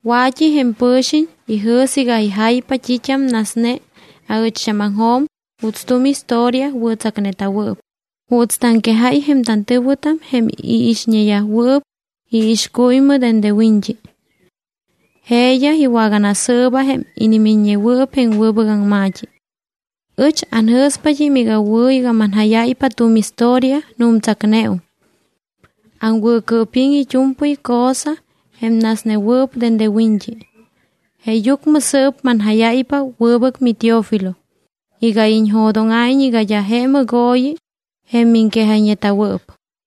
Wa̱t́i jém pɨ̱xiñ ijɨ̱s iga ijaypa t́it́am nasne aɨcht́ámaŋjo̱m juuts tu̱m historia wɨ̱tsacneta̱wɨɨp, juuts taŋquejáy jém tantɨ̱wɨtam jém iixñeyajwɨɨp iixcuymɨ dende wiñt́i. Jeeyaj iwaganasɨɨba jém inimiññewɨɨp jém wɨbɨc aŋma̱t́i. Ɨch anjɨ̱spat́im iga wɨ̱ iga manjáyáypa tu̱m historia, nu̱mtsacneum. Aŋwɨ̱cɨɨpiŋ it́u̱mpɨy cosa jém nasnewɨɨp dende wiñt́i. Jeeyucmɨ sɨɨp manjáyáypa, wɨbɨc miTeófilo, iga iñjo̱dóŋa̱iñ iga d́a je mɨgooyi jém miŋquejayñeta̱wɨɨp.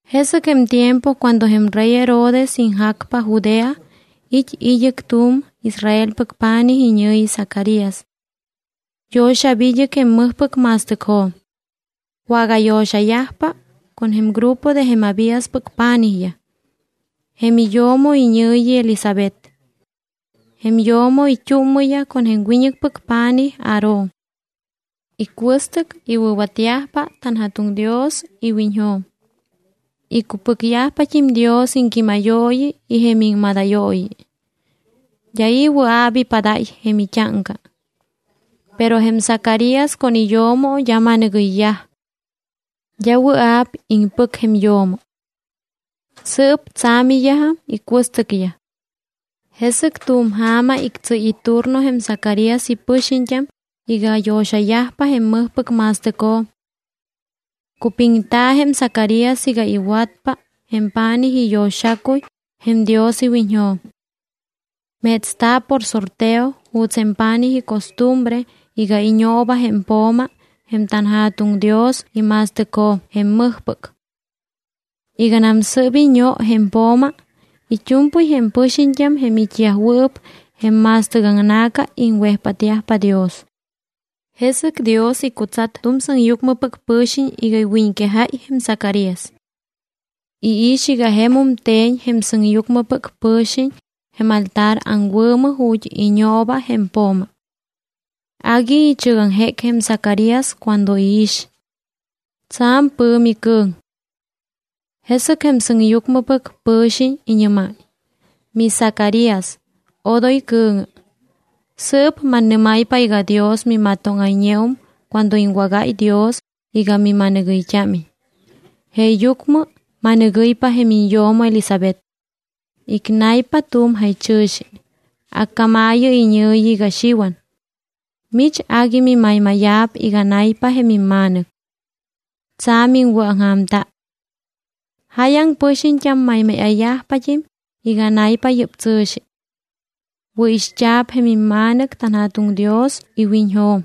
Jesɨc jém tiempo cuando jém rey Herodes iŋjacpa Judea, it́ id́ɨc tu̱m Israelpɨc pa̱nij iñɨ̱yi Zacarías. Yo̱xa̱p id́ɨc jém mɨjpɨc ma̱stɨcjo̱m. Wagayo̱xayajpa con jém grupo de jém Abíaspɨc pa̱nijyaj. Jém iyo̱mo iñɨ̱yi Elisabet. Jém yo̱mo it́úmmɨyaj con jém wiñɨcpɨc pa̱nij Aarón. Icuɨstɨc iwɨ̱watyajpa tanJa̱tuŋ Dios iwiñjo̱m. Icupɨcyajpat́im Dios iŋquímayooyi y jém iŋmadayooyi. D́a i̱ wɨa̱p ipadáy jém it́áŋca. Pero jém Zacarías con iyo̱mo d́a ma̱nɨgɨyyaj. D́a wɨa̱p iŋpɨc jém yo̱mo. Sɨɨp tsa̱miyajam icuɨstɨcyaj. Jesɨc tu̱m ja̱ma ictsɨ́y iturno jém Zacarías ipɨxiñt́am iga yo̱xayajpa jém mɨjpɨc ma̱stɨcjo̱m. Cupiŋta̱ jém Zacarías iga iwatpa jém pa̱nij iyo̱xacuy jém Dios iwiñjo̱m. Metsta̱ por sorteo juuts jém pa̱nij icostumbre iga iñooba jém po̱ma jém tanJa̱tuŋ Dios ima̱stɨcjo̱m jém mɨjpɨc. Iganam sɨ́p iño jém po̱ma, it́u̱mpɨy jém pɨxiñt́am jém it́yajwɨɨp jém ma̱stɨc aŋna̱ca iŋwejpátyajpa Dios. Jesɨc Dios icutsat tu̱m sɨŋyucmɨpɨc pɨ̱xiñ iga iwiñquejáy jém Zacarías. Iix iga jemum te̱ñ jém sɨŋyucmɨpɨc pɨ̱xiñ jém altar aŋwɨ̱mɨ ju̱t́ iñooba jém po̱ma. Agui ichɨgaŋjéc jém Zacarías cuando iix. Tsa̱m pɨ̱mi cɨ̱ŋ. Jesɨc jém sɨŋyucmɨpɨc pɨ̱xiñ iñɨ́máy: —MiZacarías, odoy cɨ̱ŋɨ. Sɨɨp mannɨ́máypa iga Dios mimatóŋayñeum cuando iŋwágáy Dios iga mima̱nɨgɨyt́ámiñ. Jeeyucmɨ ma̱nɨgɨ́ypa jém iñyo̱mo Elisabet. Icnaypa tu̱m jaychɨ̱xi, accámaayɨ iñɨ̱yi iga Xiwan. Mich agui mimaymáya̱p iga naypa jém imma̱nɨc. Tsa̱m iŋwɨ̱aŋja̱mta. Jáyaŋ pɨxiñt́am maymáya̱yajpat́im iga naypa yɨ́p tsɨ̱xi. Wɨ̱ixt́a̱p jém imma̱nɨc tanJa̱tuŋ Dios iwiñjo̱m.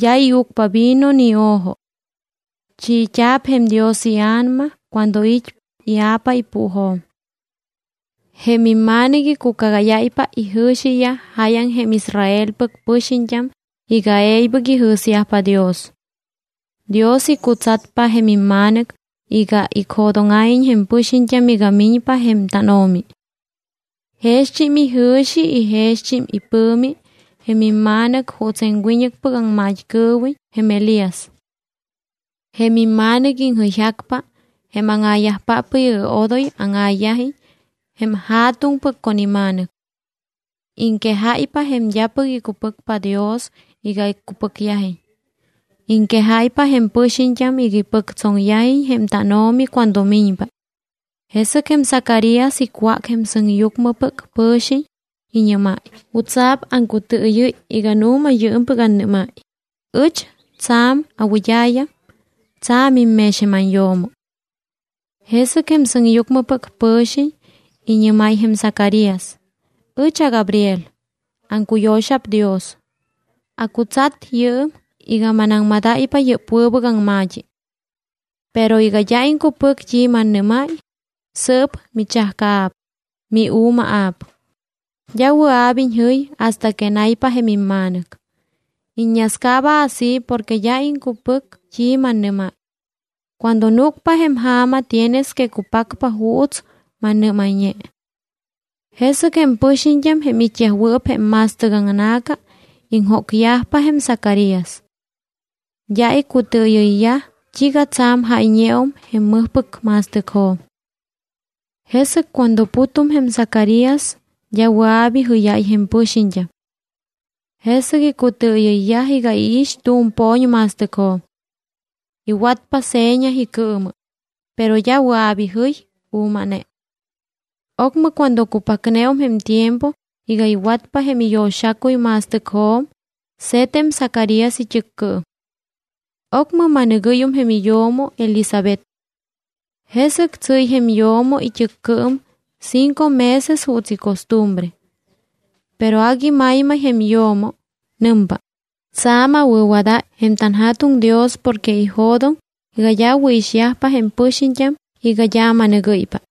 D́a iucpa vino ni o̱jo. Chiit́a̱p jém Dios iA̱nama cuando it́ ia̱pa ipuujo̱m. Jém imma̱nɨc icucagáyáypa ijɨ̱xiyaj jáyaŋ jém Israelpɨc pɨxiñt́am iga e̱ybɨc ijɨ̱syajpa Dios. Dios icutsatpa jém imma̱nɨc iga icjo̱dóŋa̱iñ jém pɨxiñt́am iga miñpa jém tánO̱mi. Jext́im ijɨ̱xi y jext́im ipɨ̱mi jém imma̱nɨc juuts jém wiñɨcpɨc aŋmat́cɨɨwiñ jém Elías. Jém imma̱nɨc iŋjɨyjacpa jém áŋa̱yajpáppɨc iga odoy áŋa̱yajiñ jém ja̱tuŋpɨc con ima̱nɨc. Iŋquejáypa jém d́apɨc icupɨcpa Dios iga icupɨcyajiñ. Iŋquejáypa jém pɨxiñt́am iga ipɨctsoŋyajiñ jém tánO̱mi cuando miñpa. Jesɨc jém Zacarías icwác jém sɨŋyucmɨpɨc pɨ̱xiñ. Iñɨ́máy: —¿Jutsa̱p aŋcutɨɨyɨ́y iga nu̱ma yɨɨmpɨc annɨ́máy? Ɨch tsa̱m awɨd́a̱yam, tsa̱mim mex jém anyo̱mo. Jesɨc jém sɨŋyucmɨpɨc pɨ̱xiñ iñɨ́máy jém Zacarías: —Ɨch aGabriel. Aŋcuyo̱xa̱p Dios. Acutsat yɨɨm iga manaŋmadáypa yɨ́p wɨbɨc aŋma̱t́i. Pero iga d́a iŋcupɨc t́i mannɨ́máy, sɨɨp michajcaa̱p, miu̱maa̱p. D́a wɨa̱p iñjɨy hasta que naypa jém imma̱nɨc. Iññascaaba así porque d́a iŋcupɨc t́i mannɨ́máy. Cuando núcpa jém ja̱ma tienes que cupacpa juuts mannɨ́mayñe. Jesɨc jém pɨxiñt́am jém it́yajwɨɨp jém ma̱stɨc aŋna̱ca iŋjócyajpa jém Zacarías. D́a icutɨɨyɨyyaj t́iiga tsa̱m jáyñeum jém mɨjpɨc ma̱stɨcjo̱m. Jesɨc cuando putum jém Zacarías d́a wɨa̱p ijɨ́yáy jém pɨxiñt́am. Jesɨc icutɨɨyɨyyaj iga iix tu̱m po̱ñ ma̱stɨcjo̱m. Iwatpa seña icɨɨmɨ, pero d́a wɨa̱p ijɨy, u̱maa̱ne. Ocmɨ cuando cupacneum jém tiempo iga iwat jém iyo̱xacuy ma̱stɨcjo̱m, se̱t jém Zacarías it́ɨccɨɨm. Ocmɨ ma̱nɨgɨ́yum jém iyo̱mo Elisabet. Jesɨc tsɨ́y jém yo̱mo it́ɨccɨɨm cinco meses juuts icostumbre. Pero agui maymay jém yo̱mo. Nɨmpa: “Tsa̱m awɨ̱wadáy jém tanJa̱tuŋ Dios porque ijo̱doŋ iga d́a awɨ̱ixyajpa jém pɨxiñt́am iga d́a ama̱nɨgɨ́ypa.”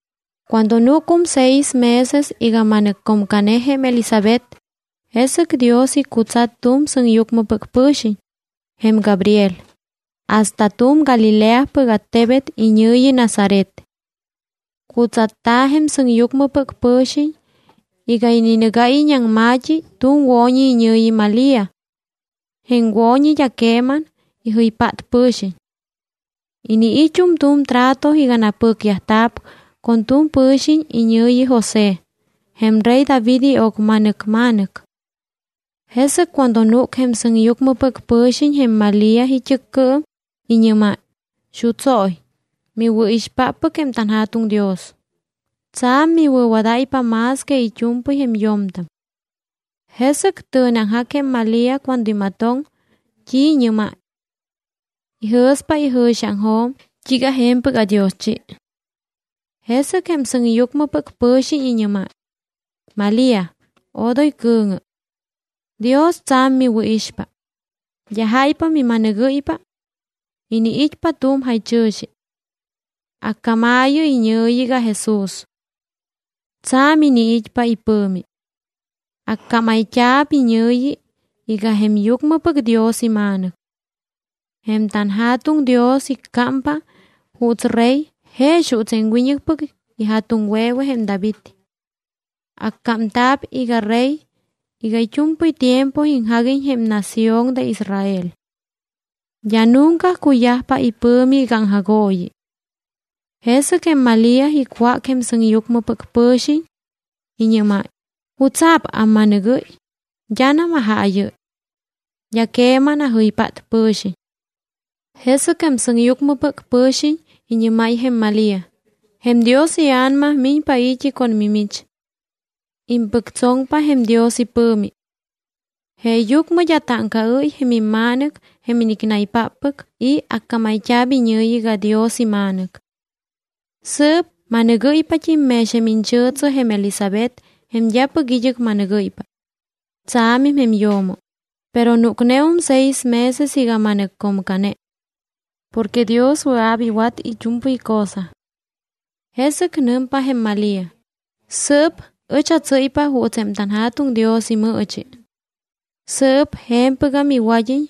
Cuando núcum seis meses iga ma̱nɨccomcane jém Elisabet, jesɨc Dios icutsat tu̱m sɨŋyucmɨpɨc pɨ̱xiñ, jém Gabriel, hasta tu̱m Galileapɨc attebet iñɨ̱yi Nazaret. Cutsatta̱ jém sɨŋyucmɨpɨc pɨ̱xiñ iga ininɨgáyiñ aŋma̱t́i tu̱m wo̱ñi iñɨ̱yi Malía. Jém wo̱ñi d́a queman ijɨypát pɨ̱xiñ. Iniit́um tu̱m trato iga napɨcyajta̱p con tu̱m pɨ̱xiñ iñɨ̱yi José, jém rey David io̱cma̱nɨc ma̱nɨc. Jesɨc cuando núc jém sɨŋyucmɨpɨc pɨ̱xiñ jém Malía it́ɨccɨɨm, iñɨ́máy: —¡Xutsóy, miwɨ̱ixpáppɨc jém tanJa̱tuŋ Dios! Tsa̱m miwɨ̱wadáypa más que it́u̱mpɨy jém yo̱mtam. Jesɨc tɨ̱neaŋjac jém Malía cuando imatoŋ t́i iñɨ́máy. Ijɨ̱spa ijɨ̱xiaŋjo̱m iga: “¿T́iiga je̱mpɨc adioschi?” Jesɨc jém sɨŋyucmɨpɨc pɨ̱xiñ iñɨ́máy: —Malía, odoy cɨ̱ŋɨ. Dios tsa̱m miwɨ̱ixpa. D́a jáypa mima̱nɨgɨ́ypa. Iniit́pa tu̱m jaychɨ̱xi. Accámaayɨ iñɨ̱yi iga JESÚS. Tsa̱m iniit́pa ipɨ̱mi. Accámayt́a̱p iñɨ̱yi iga jém Yucmɨpɨc Dios iMa̱nɨc. Jém tanJa̱tuŋ Dios iccámpa juuts Rey jex juuts jém wiñɨcpɨc ija̱tuŋwe̱we jém David. Accámta̱p iga Rey iga it́u̱mpɨy tiempo iŋjaguiñ jém nación de Israel. D́a nunca cuyajpa ipɨ̱mi iga aŋjagooyi. Jesɨc jém Malía icwác jém sɨŋyucmɨpɨc pɨ̱xiñ. Iñɨ́máy: —¿Jutsa̱p amma̱nɨgɨ́y? D́anam ajaayɨ́y. D́a queman ajɨypát pɨ̱xiñ. Jesɨc jém sɨŋyucmɨpɨc pɨ̱xiñ iñɨ́máy jém Malía: —Jém Dios iA̱nama miñpa i̱t́i con mimich. Impɨctsoŋpa jém Dios ipɨ̱mi. Jeeyucmɨ d́a táŋcaɨ́y jém imma̱nɨc jém inicnaypáppɨc y accámayt́a̱p iñɨ̱yi iga Dios iMa̱nɨc. Sɨɨp ma̱nɨgɨ́ypat́im mex jém iñchɨ̱tsɨ jém Elisabet jém d́apɨc id́ɨc ma̱nɨgɨ́ypa. Tsa̱mim jém yo̱mo, pero núcneum seis meses iga ma̱nɨccomcane. Porque Dios wɨa̱p iwat it́u̱mpɨy cosa. Jesɨc nɨmpa jém Malía: —Sɨɨp ɨch atsɨ́ypa juuts jém tanJa̱tuŋ Dios imɨɨchi. Sɨɨp je̱mpɨgam iwad́iñ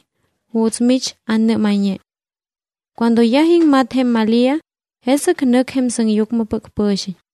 juuts mich annɨ́mayñe. Cuando yaj iŋmat jém Malía, jesɨc nɨc jém sɨŋyucmɨpɨc pɨ̱xiñ.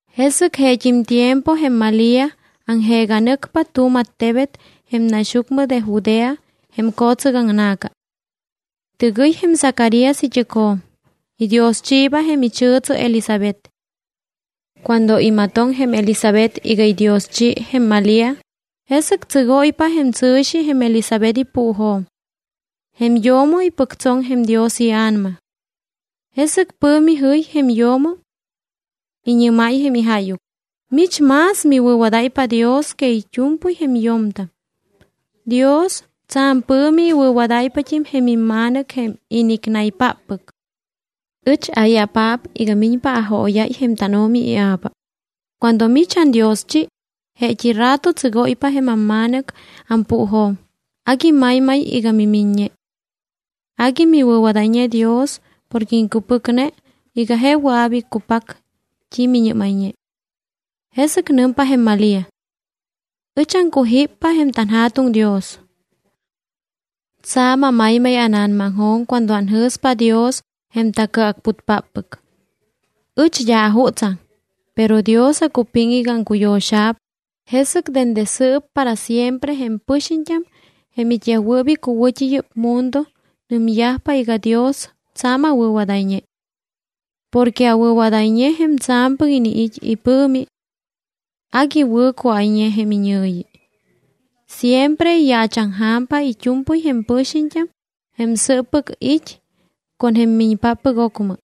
Jesɨc jeet́im tiempo jém Malía aŋjeega nɨcpa tu̱m attebet jém naxyucmɨ de Judea jém co̱tsɨc aŋna̱ca. Tɨgɨy jém Zacarías it́ɨcjo̱m. Idioschiiba jém ichɨ̱tsɨ Elisabet. Cuando imatoŋ jém Elisabet iga idioschi jém Malía, jesɨc tsɨgóypa jém tsɨ̱xi jém Elisabet ipuujo̱m. Jém yo̱mo ipɨctsoŋ jém Dios iA̱nama. Jesɨc pɨ̱mi jɨy jém yo̱mo. Iñɨ́máy jém ijáyuc: —Mich más miwɨ̱wadáypa Dios que it́u̱mpɨy jém yo̱mtam. Dios tsa̱m pɨ̱mi iwɨ̱wadáypat́im jém imma̱nɨc jém inicnaypáppɨc. ¿Ɨch ai̱apaap iga miñpa ajóyáy jém tánO̱mi ia̱pa? Cuando mich andioschi, jeet́i rato tsɨgóypa jém amma̱nɨc ampuujo̱m, agui maymay iga mimiññe. Agui miwɨ̱wadayñe Dios porque iŋcupɨcne iga je wɨa̱p iccupac t́i miñɨ́mayñe. Jesɨc nɨmpa jém Malía: Ɨch aŋcujíppa jém tanJa̱tuŋ Dios. Tsa̱m amaymay ána̱namajo̱m cuando anjɨ̱spa Dios jém tacɨacputpáppɨc. Ɨch d́a ajutsaŋ, pero Dios acupiŋ iga aŋcuyo̱xa̱p, jesɨc dende sɨɨp para siempre jém pɨxiñt́am jém it́yajwɨɨp icuwɨ̱t́i yɨ́p mundo nɨmyajpa iga Dios tsa̱m awɨ̱wadayñe. Porque awɨ̱wadayñe jém Tsa̱mpɨc iniit́ iPɨ̱mi. Agui wɨ̱ cuáyñe jém iñɨ̱yi. Siempre iyaachaŋja̱mpa it́u̱mpɨy jém pɨxiñt́am jém sɨɨppɨc it́ con jém miñpáppɨc ocmɨ,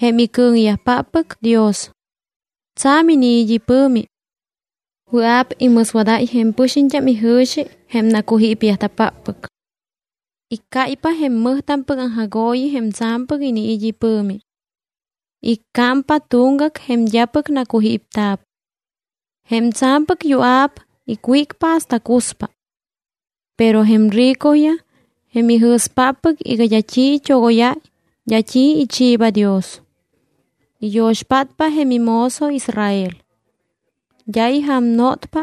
jém icɨ̱ŋyajpáppɨc Dios. Tsa̱m iniit́ ipɨ̱mi. Wɨa̱p imɨswadáy jém pɨxiñt́am ijɨ̱xi jém nacujípta̱páppɨc. Iccáypa jém mɨjtampɨc aŋjagooyi jém tsa̱mpɨc iniit́ ipɨ̱mi. Iccámpa tuŋgac jém d́apɨc nacujípta̱p. Jém tsa̱mpɨc yua̱p icwícpa hasta cuspa. Pero jém ricoyaj jém ijɨ̱spáppɨc iga d́a t́i it́ogóyáy, d́a t́i ichiiba Dios. Iyo̱xpátpa jém imozo Israel. D́a ijaamaŋnotpa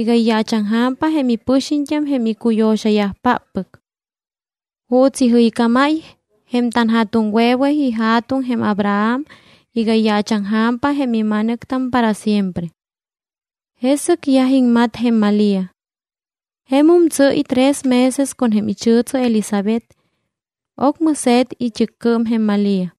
iga iyaachaŋja̱mpa jém ipɨxiñt́am jém icuyo̱xayajpáppɨc, juuts ijɨycámáy jém tanja̱tuŋwe̱we ija̱tuŋ jém Abraham iga iyaachaŋja̱myajpa jém ima̱nɨctam para siempre. Jesɨc yaj iŋmat jém Malía. Jemum tsɨ́y tres meses con jém ichɨ̱tsɨ Elisabet. Ocmɨ se̱t it́ɨcmɨ jém Malía.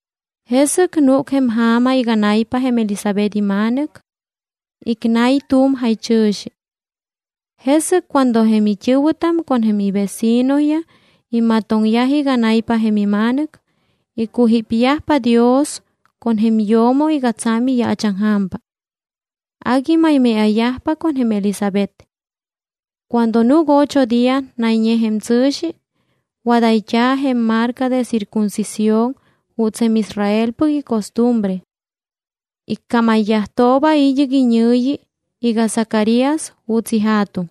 Jesɨc núc jém ja̱ma iga nay jém Elisabet ima̱nɨc. Icnay tu̱m jaychɨ̱xi. Jesɨc cuando jém it́ɨ̱wɨtam con jém ivecinoyaj imatoŋyaj iga nay jém ima̱nɨc, icujípyajpa Dios con jém yo̱mo iga tsa̱m iyaachaŋja̱mpa. Agui maymáya̱yajpa con jém Elisabet. Cuando núc ocho día nayñe jém tsɨ̱xi, wadayt́a̱ jém marca de circuncisión juuts jém Israelpɨc icostumbre. Iccámayyajtooba id́ɨc iñɨ̱yi iga Zacarías juuts ija̱tuŋ.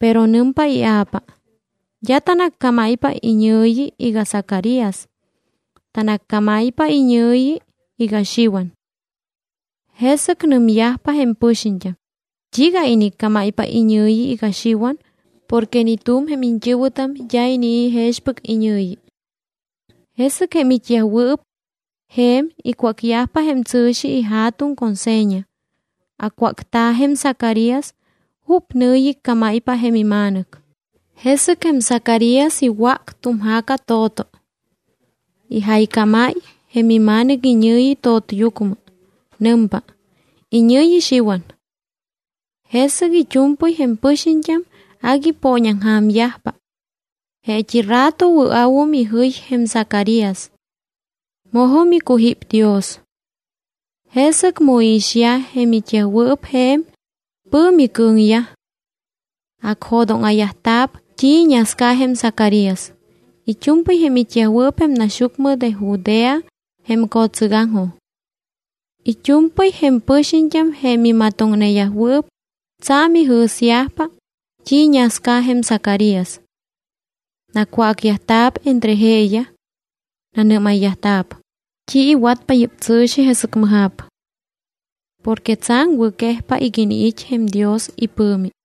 Pero nɨmpa ia̱pa: —D́a tanaccámáypa iñɨ̱yi iga Zacarías. Tanaccámáypa iñɨ̱yi iga Xiwan. Jesɨc nɨmyajpa jém pɨxiñt́am: —¿T́iiga iniccámáypa iñɨ̱yi iga Xiwan porque ni tu̱m jém iñt́ɨ̱wɨtam d́a inii̱ jexpɨc iñɨ̱yi? Jesɨc jém it́yajwɨɨp je̱m icwácyajpa jém tsɨ̱xi ija̱tuŋ con seña. Acwácta̱ jém Zacarías jup nɨ̱yi iccámáypa jém ima̱nɨc. Jesɨc jém Zacarías iwác tu̱m ja̱ca to̱to. Ijaycámáy jém ima̱nɨc iñɨ̱yi to̱tyucmɨ. Nɨmpa: “Iñɨ̱yi Xiwan.” Jesɨc it́u̱mpɨy jém pɨxiñt́am agui ipooñaŋja̱myajpa. Jeet́i rato wɨa̱wum ijɨy jém Zacarías. Mojum icujíp Dios. Jesɨc mu iixyaj jém it́yajwɨɨp je̱m, pɨ̱mi cɨ̱ŋyaj. Acjo̱dóŋa̱yajta̱p t́i iñasca jém Zacarías it́u̱mpɨy jém it́yajwɨɨp jém naxyucmɨ de Judea jém co̱tsɨgaŋjo̱m. It́u̱mpɨy jém pɨxiñt́am jém imatoŋneyajwɨɨp, tsa̱m ijɨ̱syajpa t́i iñasca jém Zacarías. Nacwácyajta̱p entre jeeyaj. Nanɨ́mayyajta̱p: —¿T́i iwatpa yɨ́p tsɨ̱xi, jesɨc mɨja̱p? Porque tsa̱m wɨ̱quejpa iga iniit́ jém Dios ipɨ̱mi.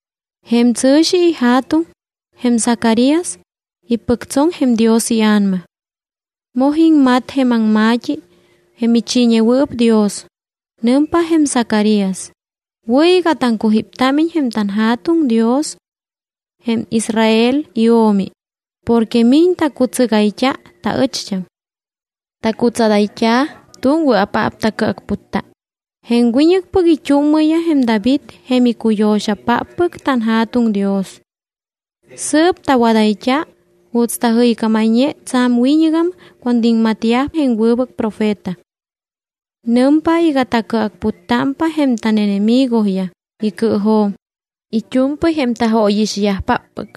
Jém tsɨ̱xi ija̱tuŋ, jém Zacarías, ipɨctsoŋ jém Dios iA̱nama. Moj iŋmat jém aŋma̱t́i jém ichiiñewɨɨp Dios. Nɨmpa jém Zacarías: Wɨ̱ iga taŋcujíptámiñ jém tanJa̱tuŋ Dios, jém Israel iO̱mi, porque miñ tacutsɨgayt́a taɨcht́am. Tacutsadayt́a̱ tu̱m wɨa̱paap tacɨacputta, jém wiñɨcpɨc it́úmmɨ jém David jém icuyo̱xapáppɨc tanJa̱tuŋ Dios. Sɨɨp tawadayt́a juuts tajɨycámayñe tsa̱m wiñɨgam cuando iŋmatyaj jém wɨbɨc profeta. Nɨmpa iga tacɨacputtámpa jém tánenemigoyaj icɨɨjo̱m, it́u̱mpɨy jém tajóyixyajpáppɨc.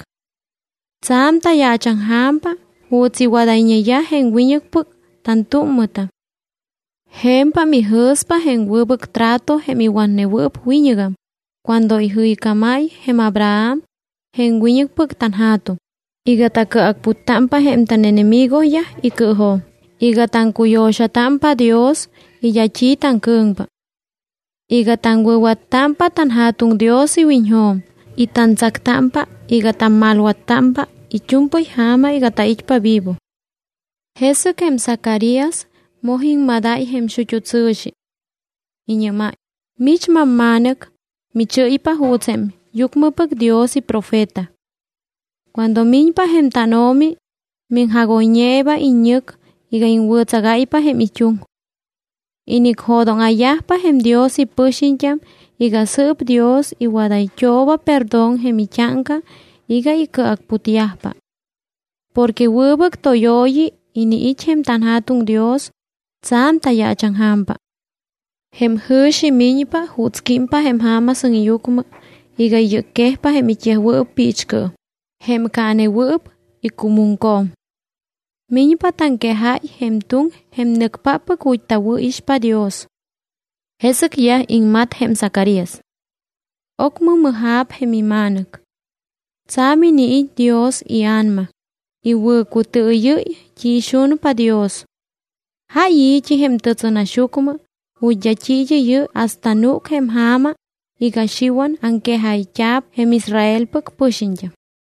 Tsa̱m tayaachaŋja̱mpa juuts iwadayñeyaj jém wiñɨcpɨc tantúmmɨtam. Je̱mpam ijɨ̱spa jém wɨbɨc trato jém iwatnewɨɨp wiñɨgam, cuando ijɨycámáy jém Abraham, jém wiñɨcpɨc tanja̱tuŋ, iga tacɨacputtámpa jém tánenemigoyaj icɨɨjo̱m iga taŋcuyo̱xatámpa Dios y d́a t́i taŋcɨ̱ŋpa, iga taŋwɨ̱wattámpa tanJa̱tuŋ Dios iwiñjo̱m y tantsactámpa iga tammalwattámpa it́u̱mpɨy ja̱ma iga tait́pa vivo. Jesɨc jém Zacarías moj iŋmadáy jém xut́u tsɨ̱xi. Iñɨ́máy: Mich mamma̱nɨc, michɨ́ypa juuts jém yucmɨpɨc Dios iprofeta. Cuando miñpa jém tánO̱mi, miŋjagoyñeeba iññɨc iga iŋwɨ̱tsagáypa jém it́uŋ. Inicjo̱dóŋa̱yajpa jém Dios ipɨxiñt́am iga sɨɨp Dios iwadayt́ooba perdón jém it́áŋca iga icɨacputyajpa. Porque wɨbɨc tóyooyi iniit́ jém tanJa̱tuŋ Dios, tsa̱m tayaachaŋja̱mpa. Jém jɨ̱xi miñpa juuts químpa jém ja̱ma sɨŋyucmɨ iga iyɨcquejpa jém it́yajwɨɨp piichcɨɨm, jém caanewɨɨp icumuŋco̱m. Miñpa taŋquejáy jém tuŋ jém nɨcpáppɨc ju̱t́ tawɨ̱ixpa Dios. Jesɨc yaj iŋmat jém Zacarías. Ocmɨ mɨja̱p jém ima̱nɨc. Tsa̱m iniit́ Dios iA̱nama, iwɨ̱cutɨɨyɨ́y t́i ixunpa Dios. Jáy i̱t́i jém tɨtsɨnaxyucmɨ ju̱t́ d́a t́i id́ɨ́yɨ́y hasta núc jém ja̱ma iga Xiwan aŋquejayt́a̱p jém Israelpɨc pɨxiñt́am.